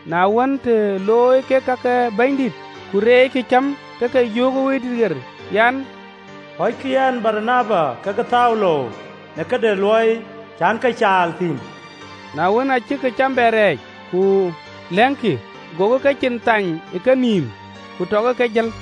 Na wën, të looi kek ka ke bɛ̈nydït, ku reeckï cäm, ke ke yöökë Wëidït ɣer an, “Pɔ̈ckï yɛn Baranaba kekë Thaulo në këde luɔi cän ke caal thïn.” Na wën, aa cïk cäm bɛ rɛɛc, ku lɛ̈ŋkï, gokï kecin thany ë kenïïm, ku tɔkï ke jël.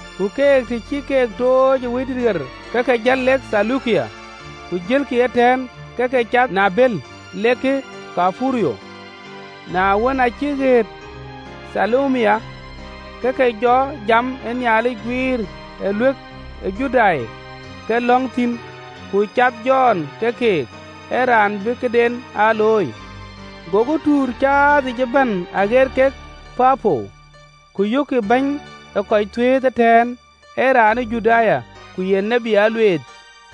Ku keek, të cï keek tooc ë Wëidït ɣer, ke ke jël lek Theleukia, ku jëlkï ëtɛ̈ɛ̈n, ke ke cath në abël lek Thaiperuth. Na wën, aa cïk ɣet Thalami, ke ke jɔ jam ë Nhialic guiir ë ɣööt ke Nhialic ye Judai ke lɔ̈ŋ thïn. Ku cath Jɔn ke keek, ee raan bï këden aa looi. Gokï tuur caathic ëbɛ̈n aɣeet kek Papo, ku yökkï bɛ̈ny ee kɔc thuëëth ëtɛ̈ɛ̈n, ee raan ë Judai, ku ye tiët alueeth,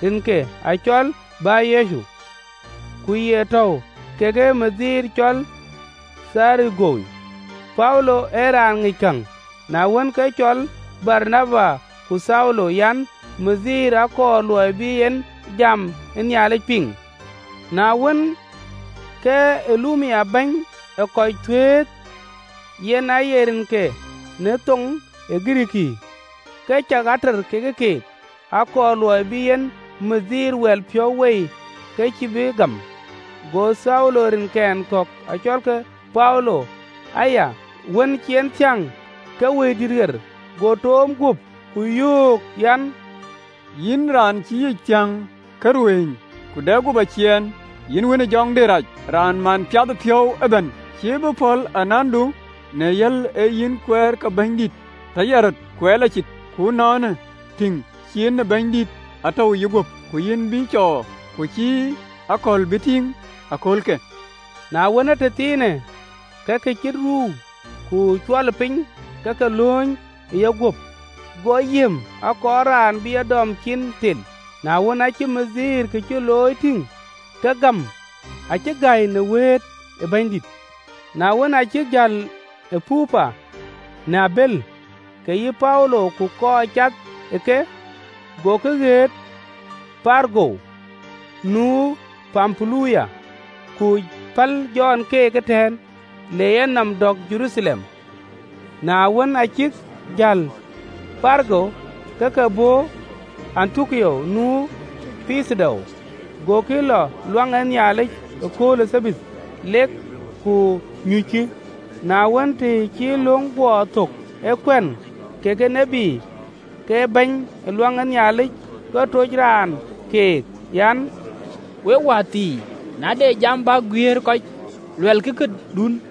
rinke acɔl Bar-Yecu. Ku ye tɔ̈u kekë bɛ̈ny cɔl Thergio Paulo, ee raan pel nɔm. Na wën, ke cɔl Baranaba ku Thaulo, yen bɛ̈ny, akɔɔr luɔi bï en jam de Nhialic piŋ. Na wën, ke Eluma bɛ̈ny ee kɔc thuëëth (yen aye rinke në thoŋ de Girikii), ke cak ater ke keek, akɔɔr luɔi bï en bɛ̈ny wɛl piɔ̈u wei ke cï bï gam. Go Thaulo, rinkɛn kɔ̈k acɔlke Paulo aya, wën cï en thiäŋ ke Wëidït ɣer go toom guöp, ku yöök an, “Yïn, raan cï yic thiäŋ ke ruëëny ku de yïguöp aciɛɛn, yïn wën ë jɔŋdït rac, raan man piathëpiɔ̈u ëbɛ̈n, cïï bï pɔ̈l anandu në yal ee yïn kuɛɛr ke Bɛ̈nydït tɔ yal röt, kuɛɛr lɔ cit? Ku ënɔɔnë, tïŋ ciin ë Bɛ̈nydït atɔ̈u ë yïguöp, ku yïn bï cɔɔr, ku cïï akɔ̈l bï tïŋ aköölkë.” Na wën, ee tëthiinë, ke ke cït ruu ku cuɔlëpiny ke ke lööny ë yeguöp, go yiëëm, akɔɔr raan bï e dɔm cin thel. Na wën, aacï bɛ̈ny kë cï looi tïŋ, ke gäm, acï gäi në wëët ë Bɛ̈nydït. Na wën, aa cïk jäl ë Papo në abël, kek yï Paulo ku kɔc cath ë ke, gokï ɣet Perga nu Pampulia: ku päl Jɔn keek ëtɛ̈ɛ̈n, le yenɔm dɔ̈k Jeruthalem. Na wën, aa cïk jäl ë Perga, ke ke bɔ̈ Antiokia nu Pithidia, gokï lɔ Luaŋ ë Nhialic ë kööl ë Thabath, lek ku nyuckï. Na wën, të cï löŋ guɔ thök ë kuɛ̈n kekë tït, ke bɛ̈ny ë luaŋ ë Nhialic ke tuc raan keek an, “We wäthii, na de jam bäk guiëër kɔc, luɛlkï këdun.”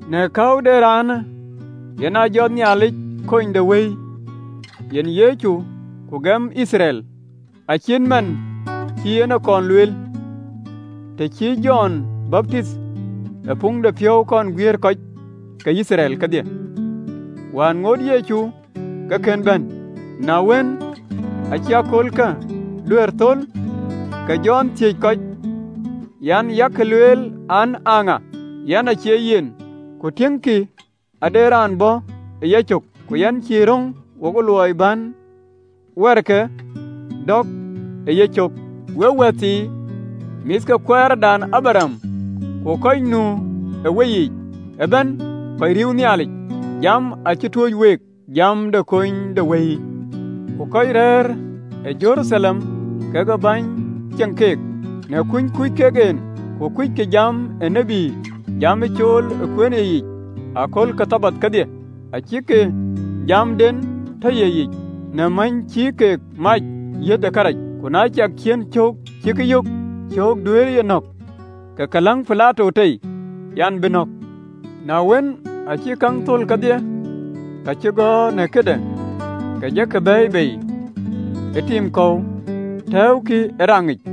Në käu de raanë, yen aa jɔtë Nhialic Konydewëi, yen Yecu, ku gëm Yithriɛl, acït man cï en e kɔn lueel. 24.Të cï Jɔn baptinh ë puŋdepiɔ̈u kɔn guiëër kɔc ke Yithriɛl kedhie, wään aŋoot Yecu ke kën bɛ̈n. 25.Na wën, aacï aköölkë duɛ̈ɛ̈r thöl, ke Jɔn thiëc kɔc an, ‘Yak lueel, an, aa ŋa? Yɛn cie yen. Ku tiëŋkï, ade raan bɔ̈ ë yacök, ku yɛn cï röŋ wo luɔi bän wɛɛrke dɔ̈k ë yecök.’ “Wek wäthii, mïth ke baai de Abraɣam, ku kɔc nu ë weyiic ëbɛ̈n kɔc riëëu Nhialic, jamë acï tuöc week, jam de Konydewëiyë! Ku kɔc rɛ̈ɛ̈r ë Jeruthalem kekë bäny ceŋ keek, në kuny kuc kek en, ku kuckï jam ë tït, jam ye cool ë kueenë yeyic ë akööl ke Thabath kedhie, acïk jamden tɔ ye yic, në mäny cï kek e mäc yeth kërac. 28.Ku na ciɛk ciën cöök cïk yök cöök duëërëye nɔ̈k, ke ke läŋ Pilato tei, an, bï nɔ̈k. 29.Na wën, aa cïk käŋ thöl kedhie ka cï gɔ̈ɔ̈r në këde, ke jɔkï bɛ̈ɛ̈i bei ë tim kɔ̈u, tɛ̈ɛ̈ukï ë raŋic.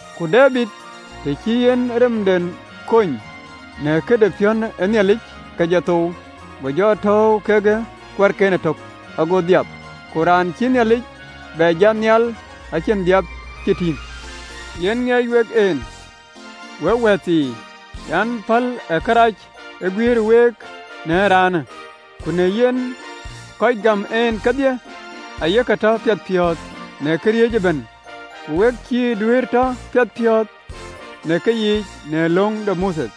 Ku Debid, të cï en remden kony në këde piɔ̈n ë Nhialic, ke jɔ thou, go jɔ tɔ̈ɔ̈u kekë kuarken ëtök, go dhiap. Ku raan cïï Nhialic bɛ jat nhial acïn dhiap cï tïŋ. Yen ŋiɛc wek en, wek wäthii an päl ë kërac aguïïrë week në ee raanë. Ku në yen, kɔc gam en kedhie aye ke tɔ piɛthpiɔ̈ɔ̈th në këriëëc ëbɛ̈n, ku we cïï duëërë tɔ piɛthpiɔ̈ɔ̈th në keyiic në löŋ de Mothe.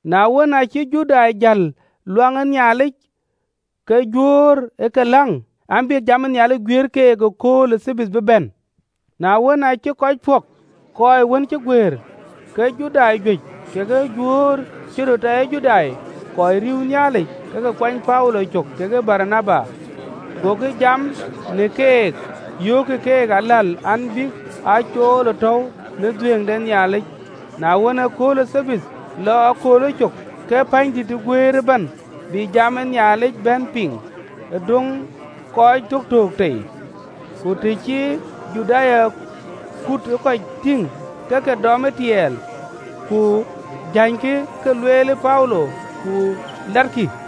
Na wën, aacï Judai jäl luaŋ ë Nhialic, ke Juöör ë ke läŋ an, bï jam ë Nhialic guiëër keek akööl ke Thabath bï bɛ̈n. Na wën, aacï kɔc pɔ̈k kɔc wën ë guëër, ke Judai juëc kekë Juöör cï röt tɔ ye Judai, kɔc riëëu Nhialic, ke ke kuany Paulo cök kekë Baranaba. Gokï jam në keek, yöökkï keek aläl an, bïk a cool ë tɔ̈u në dhuëëŋ de Nhialic yic. Na wën, ëkööl ë Thabath lɔ ë köölë cök, ke pänydït guëër ëbɛ̈n bï jam ë Nhialic bɛ̈n piŋ, adɔ̈ŋ kɔc töktöök tei. Ku të cï Judai kuut ë kɔc tïŋ, ke ke dɔm tiɛɛl, ku jänykï ka lueel Paulo, ku latkï.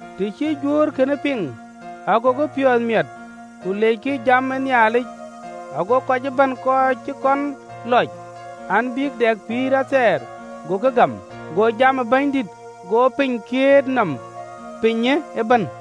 Të cï Juöör kënë piŋ, agokï piɔ̈ɔ̈th miɛt, ku leckï jam ë Nhialic, ago kɔc ëbɛ̈n kɔc cï kɔn lɔc an, bïk dɛ pïïr athɛɛr, agokï gam. Go jam ë Bɛ̈nydït go piny kiët nɔm pinyë ëbɛ̈n.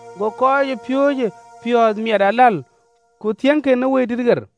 Go kɔcpiööcë piɔ̈ɔ̈th miɛt aläl, ku thiëŋkï në Wëidït ɣer.